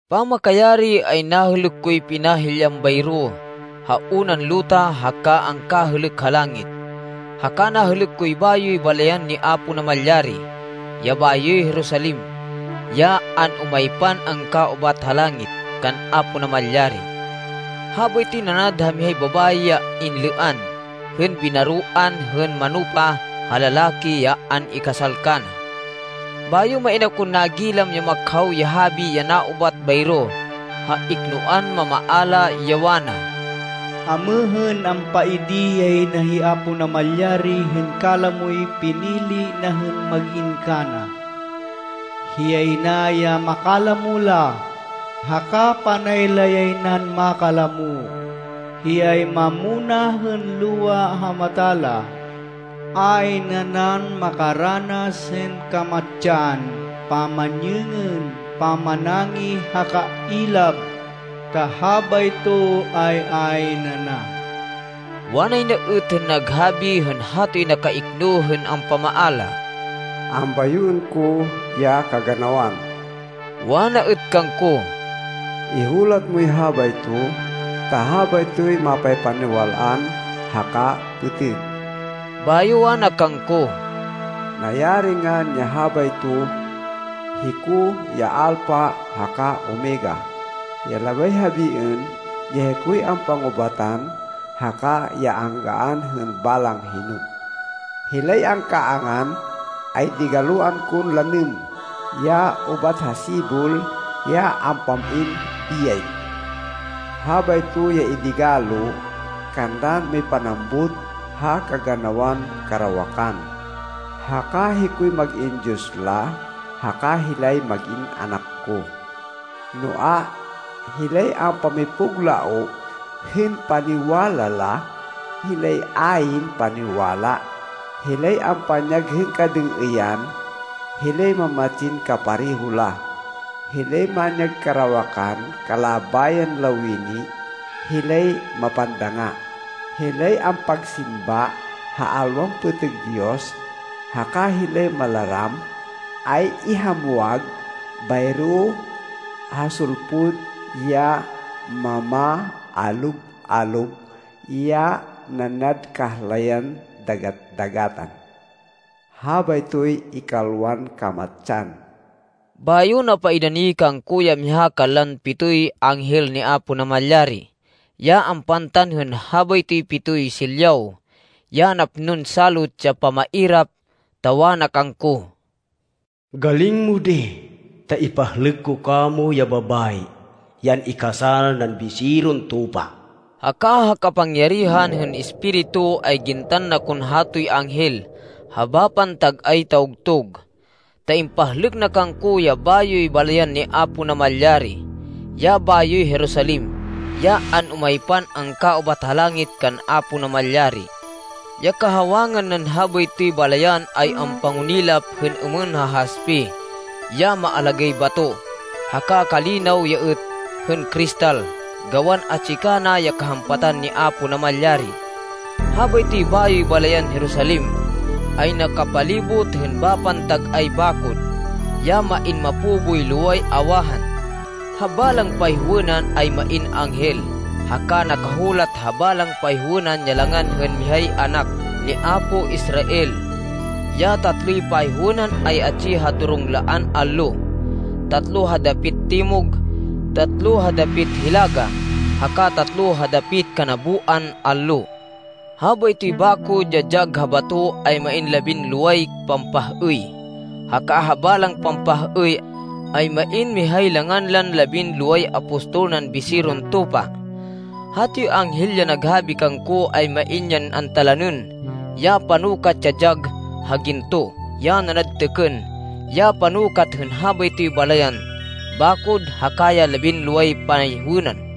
Pamakayari, ay nahêlêk koy pinahilyan bayro ha unan luta haka ha angkahêlêk ha langit. Haka nahêlêk koy bayoy balayan ni Apo Namalyari, ya bayoy Jerusalem, ya an-umaypan angkaubat ha langit, kan Apo Namalyari. Habaytoy nanad ha mihay babayi ya inlêan hên binaroan hên manupa ha lalaki ya an-ikasal kana. Bayo main akon nagilam ya makhaw ya habi ya naubat bayro ha iknoan mamaala, ya wana, “Amêhên, ampaidi yay na hi Apo Namalyari hên kalamoy pinili na hên mag-in kana. Hiyay na ya makalamo la, haka panay la yay nan makalamo. Hiyay mamunah hên luwa ha mata la. Ayn nanan makaranas hên kamatsan, pamanyêngên, pamanangih haka ilab, ta habayto ay ayn ana.” Wanay na êt hên naghabi hên hatoy nakaikno hên ampamaala, “Ambayoên ko ya kaganawan.” Wana êt kangko, “Ihulat moy habayto ta habaytoy mapaypaniwal-an haka pêtêg.” Bayo wana kangko, “Nayari ngan ya habayto! Hiko ya Alpha haka Omega, ya labay habiên, ya hikoy ampangubatan haka ya anggaan hên balang hino. Hilay angkaangan, ay digaloan kon lanêm ya ubat ha sibol ya ampam-in biyay. Habayto ya idigalo kanlan mipanambut ha kaganawan karawakan, haka hikoy mag-in Diyos la haka hilay mag-in anak ko. Noa, hilay ampamipuglaoh hên paniwala la, hilay ayn paniwala, hilay ampanyag hên kadêng-êyan, hilay mamatsin kapareho la, hilay manyag karawakan kalabayan lawini, hilay mapandanga, hilay ampagsimba ha alwan pêtêg diyos, haka hilay malaram, ay ihamwag bayro ha sulpud ya mamaalob-alob ya nanad kahlayan dagat-dagatan. Habaytoy ikalwan kamatsan.” Bayo napaidani kangko ya miha kanlan pitoy anghel ni Apo Namalyari ya ampantan hên habaytoy pitoy silyaw ya napnon salot ya pamairap, ta wana kangko, “Galing mo di, ta ipahlêk ko kamo ya babayi, ya an-ikasal nan Biseron Tupa.” Haka ha kapangyarihan hên Espiritu, ay gintan na kon hatoy anghel ha bapan tag-ay tawgtug, ta impahlêk na kangko ya bayoy balayan ni Apo Namalyari, ya bayoy Jerusalem, ya an-umaypan angkaubat ha langit, kan Apo Namalyari. Ya kahawangan nan habaytoy balayan ay ampangunilap hên êmên ha haspe ya maalagáy bato, haka kalinaw ya êt hên kristal, gawan atsi kana ya kahampatan ni Apo Namalyari. Habaytoy bayoy balayan Jerusalem, ay nakapalibot hên bapan tag-ay bakod ya main mapo boy loway awahan. Ha balang payhowênan ay main anghel, haka nakahulat ha balang payhowênan ya langan hên mihay anak ni apo Israel. Ya tatloy payhowênan ay atsi ha durunglaan allo, tatlo ha dapit timog, tatlo ha dapit hilaga, haka tatlo ha dapit kanaboan allo. Habaytoy bakod ya dyag ha bato ay main labinloway pampah-êy haka ha balang pampah-êy, ay main mihay langan lan labinloway apostol nan Biseron Tupa. Hatoy anghel ya naghabi kangko, ay main yan antalanên ya panukat ya dyag ha ginto, ya nanad têkên, ya panukat hên habaytoy balayan, bakod haka ya labinloway payhowênan.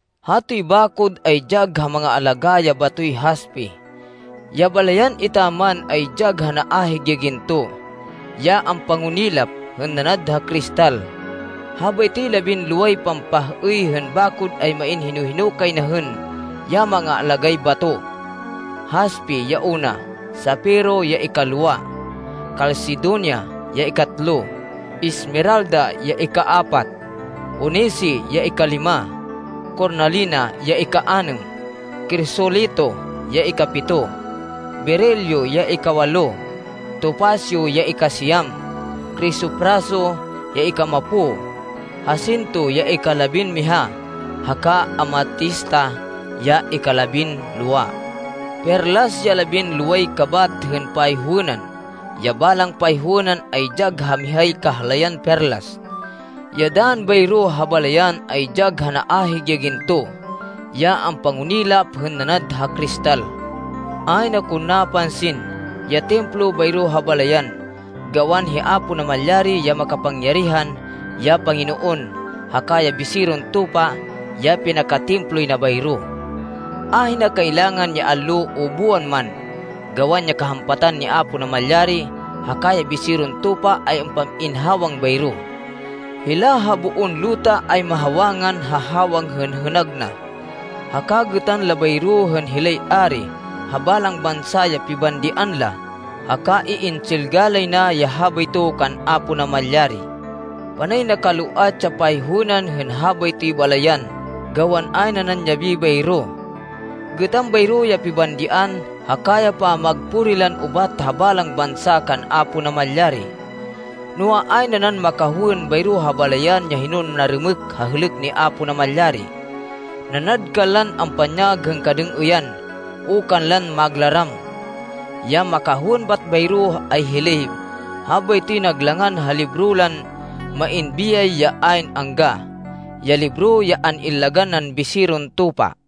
Hatoy bakod ay dyag ha mangaalagá ya batoy haspe. Ya balayan etaman ay dyag ha naahig ya ginto, ya ampangunilap hên nanad ha kristal. Habaytoy labinloway pampah-êy hên bakod ay main hino-hino kay na hên ya mangaalagáy bato. Haspe ya una, sapiro ya ikalwa, kalsedonia ya ikatlo, esmeralda ya ikaapat, onise ya ikalima, kornalina ya ikaanêm, krisolito ya ikapito, berilo ya ikawalo, topasyo ya ikasiyam, krisopraso ya ikamapo, hasinto ya ikalabinmiha, haka amatista ya ikalabinlowa. Perlas ya labinloway kabat hên payhowênan. Ya balang payhowênan ay dyag ha mihay kahlayan perlas. Ya dann bayro ha balayan ay dyag ha naahig ya ginto, ya ampangunilap hên nanad ha kristal. Ayn akon napansin ya Templo bayro ha balayan, gawan hi Apo Namalyari, ya makapangyarihan ya Panginoon haka ya Biseron Tupa, ya pinaka-Temploy na bayro. Ahina kailangan ya allo o buwan man, gawan ya kahampatan ni Apo Namalyari haka ya Biseron Tupa ay ampam-in hawang bayro. Hila ha boon luta ay mahawangan ha hawang hên hênag na. Haka gêtan la bayro hên hilay ari ha balang bansa ya pibandian la haka iintsilga lay na ya habayto kan Apo Namalyari. Panay nakaloat ya payhowênan hên habaytoy balayan gawan ayn nanan yabi bayro. Gêtan bayro ya pibandian haka ya pamagpuri lan ubat ha balang bansa kan Apo Namalyari. Noa, ayn nanan makahowên bayro ha balayan ya hinon narêmêk ha hêlêk ni Apo Namalyari, nanad kanlan ampanyag hên kadêng-êyan o kanlan maglaram. Ya makahowên bat bayro ay hilay habaytoy nag langan ha libro lan main biyay ya ayn angga, ya libro ya an-illagan nan Biseron Tupa.